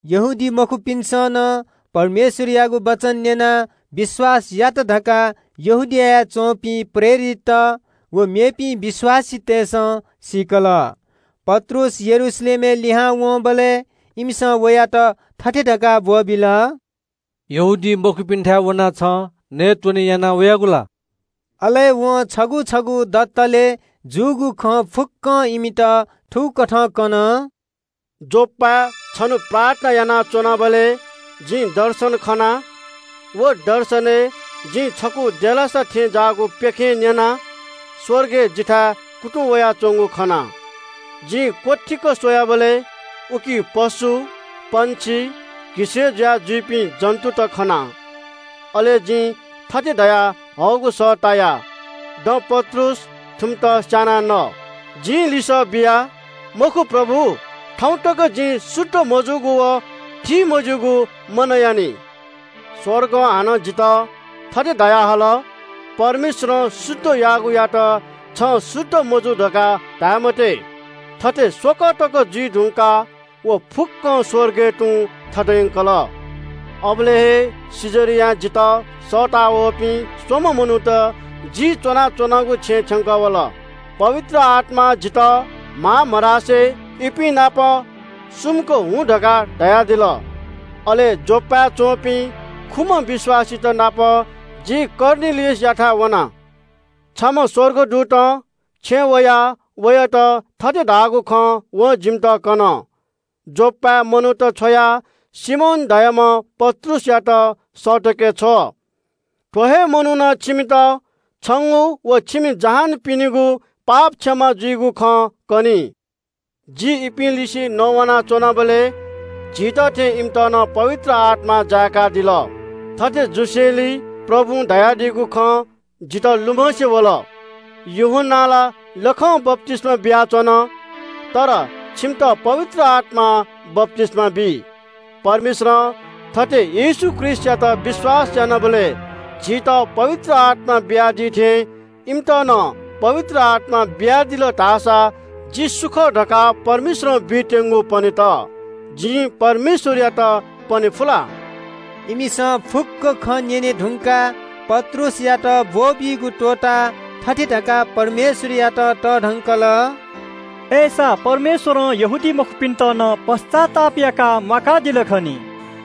यहूदीमखुपिन्‍सं नं परमेश्‍वरयागु वचन न्‍यनाः विश्‍वास यात धकाः यहूदियाय् च्‍वंपिं प्रेरितत व मेपिं विश्‍वासीतय्‌सं सीकल। पत्रुस यरूशलेमय् लिहां वंबलय् इमिसं वयात थथे धकाः ब्‍वःबिल – “यहूदीमखुपिन्‍थाय् वनाः छं नयेत्‍वने याना वयागु ला?” अले वं छगू छगू दतले जूगु खँ फुक्‍कं इमित थुकथं कन – “योप्‍पाय् छन्‍हु प्रार्थना यानाच्‍वनाबलय् जिं दर्शन खना। व दर्शनय् जिं छकू देलासा थें ज्‍याःगु प्‍यखें कुन्‍चाय् ज्‍वनाः स्‍वर्गं जिथाय् कुतुं वयाच्‍वंगु खना। जिं क्‍वथीक स्‍वयाबलय् उकी पशु, पक्षी, घिसय्‌ जुया जुइपिं जन्‍तुत खना। अले जिं थथे धयाहःगु सः ताया – ‘दँ पत्रुस, थुमित स्‍यानाः न।’ “जिं लिसः बिया – ‘मखु प्रभु, थौं तक जिं शुद्ध मजूगु व थीमज्‍यूगु मनयानि।’ “स्‍वर्गं हानं जितः थथे धयाहल – ‘परमेश्‍वरं शुद्ध याःगुयात छं शुद्ध मजू धकाः धाये मते।’ थथे स्‍वकः तक जुइ धुंकाः व फुक्‍कं स्‍वर्गय् तुं थत यंकल। “अबलय् हे कैसरियां जितः सःतःवःपिं स्‍वम्‍ह मनूत जि च्‍वनाच्‍वनागु छेँय् थ्‍यंकः वल। पवित्र आत्‍मां जितः म्‍हां मधासे इपिं नाप सुमुक हुँ धकाः धयादिल। अले योप्‍पाय् च्‍वंपिं खुम्‍ह विश्‍वासीतनाप जि कर्नेलियसयाथाय् वना। छम्‍ह स्‍वर्गदूतं छेँय् वयाः वयात थथे धाःगु खँ वं जिमित कन – ‘योप्‍पाय् मनूत छ्वयाः सिमोन धाःम्‍ह पत्रुसयात सःतके छ्व। थ्‍व हे मनुखं छंगु व छिमि फुक्‍क जहानपिनिगु पाप क्षमा जुइगु खँ कनी।’ “जि इपिं लिसे नवाना च्‍वनाबलय् झीत थें इमित नं पवित्र आत्‍मां जाय्‌कादिल। थथे जुसेंलि प्रभुं धयादीगु खँ जितः लुमंसे वल – ‘यूहन्‍नां ला लखं बप्‍तिस्‍मा बियाच्‍वन, अय्‌नं छिमित पवित्र आत्‍मां बप्‍तिस्‍मा बी।’ परमेश्‍वरं थथे येशू ख्रीष्‍टयात विश्‍वास यानाः झीत पवित्र आत्‍मा बियादी थें इमित नं पवित्र आत्‍मा बियादिल धाःसा जि सु खः धकाः परमेश्‍वरं बीत्‍यंगु पनेत, जिं परमेश्‍वरयात पने फु ला?” इमिसं फुक्‍क खँ न्‍यने धुंकाः पत्रुसयात ब्‍वःबीगु त्‍वःताः थथे धकाः परमेश्‍वरयात तःधंकल – “अय्‌सा परमेश्‍वरं यहूदीमखुपिन्‍त नं पश्‍चाताप याकाः म्‍वाकादिल खनी।”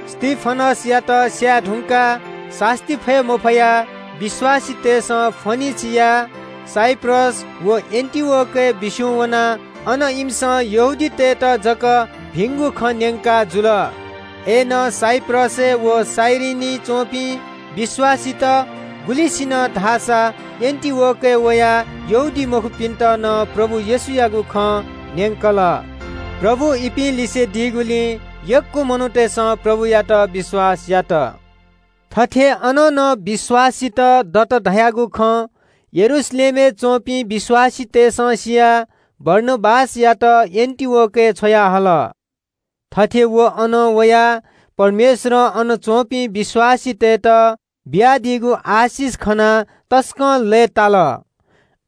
स्‍तिफनसयात स्‍यायेधुंकाः सास्‍ती फये मफयाः विश्‍वासीतय्‌सं फोनिके, साइप्रस व एन्‍टिओखियाय् बिस्‍युं वनाः अन इमिसं यहूदीतय्‌त जक भिंगु खँ न्‍यंकाजुल। अय्‌नं साइप्रसय् व कुरेनीइ च्‍वंपिं विश्‍वासीत गुलिसिनं धाःसा एन्‍टिओखियाय् वयाः यहूदीमखुपिन्‍त नं प्रभु येशूयागु खँ न्‍यंकल। प्रभु इपिं लिसे दीगुलिं यक्‍व मनूतय्‌सं प्रभुयात विश्‍वास यात। थथे अन नं विश्‍वासीत दत धयागु खँ यरूशलेमया मण्‍डलीयापिन्‍सं सियाः बारनाबासयात एन्‍टिओखियाय् छ्वयाहल। थथे व अन वयाः परमेश्‍वरं अन च्‍वंपिं विश्‍वासीतय्‌त बियादीगु आशिष खनाः तसकं लय्‌ताल।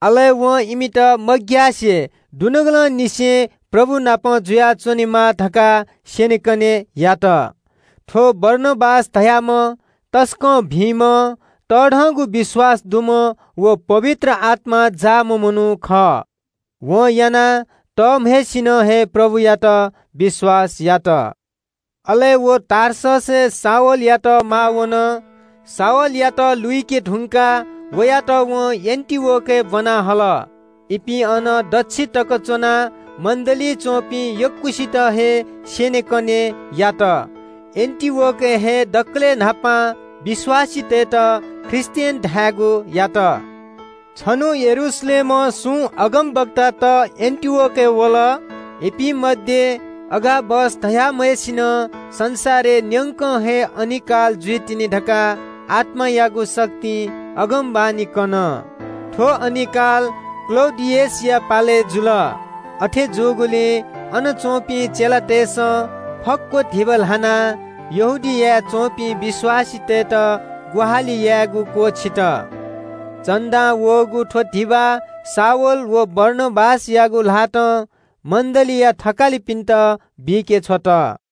अले वं इमित मग्‍यासे दुनुगलंनिसें प्रभु नाप जुयाच्‍वनेमाः धकाः स्‍यनेकने यात। थ्‍व बारनाबास धाःम्‍ह तसकं भिंम्‍ह तःधंगु विश्‍वास दुम्‍ह व पवित्र आत्‍मां जाःम्‍ह मनू खः। वं यानाः तःम्‍हय्‌सिनं हे प्रभुयात विश्‍वास यात। अले व टार्ससय् शाऊलयात माः वन। लुइके धुंकाः वयात एन्‍टिओखियाय् ब्‍वना हल। इपिं अन दच्‍छि तक च्‍वनाः मण्‍डलीइ च्‍वंपिं यक्‍वसित हे स्‍यनेकने यात। एन्‍टिओखियाय् हे दकलय् न्‍हापां विश्‍वासीतय्‌त ख्रीष्‍टियन धायेगु यात। छन्‍हु यरूशलेमं सुं अगमवक्तात एन्‍टिओखियाय् वल। इपिं मध्‍ये अगाबस धाःम्‍हय्‌सिनं संसारय् न्‍यंक हे अनिकाल जुइतिनि धकाः आत्‍मायागु शक्तिं अगमवाणी कन। थ्‍व अनिकाल कैसर क्‍लौडियसया पालय् जुल। अथे जूगुलिं अन च्‍वंपिं चेलातय्‌सं फक्‍व धिबा ल्‍हानाः यहूदियाय् च्‍वंपिं विश्‍वासीतय्‌त ग्‍वाहालि यायेगु क्‍वःछित। मुंगु भेटी शाऊल व बारनाबासयागु ल्‍हातं यरूशलेमया मण्‍डलीया थकालिपिन्‍त बीके छ्वल।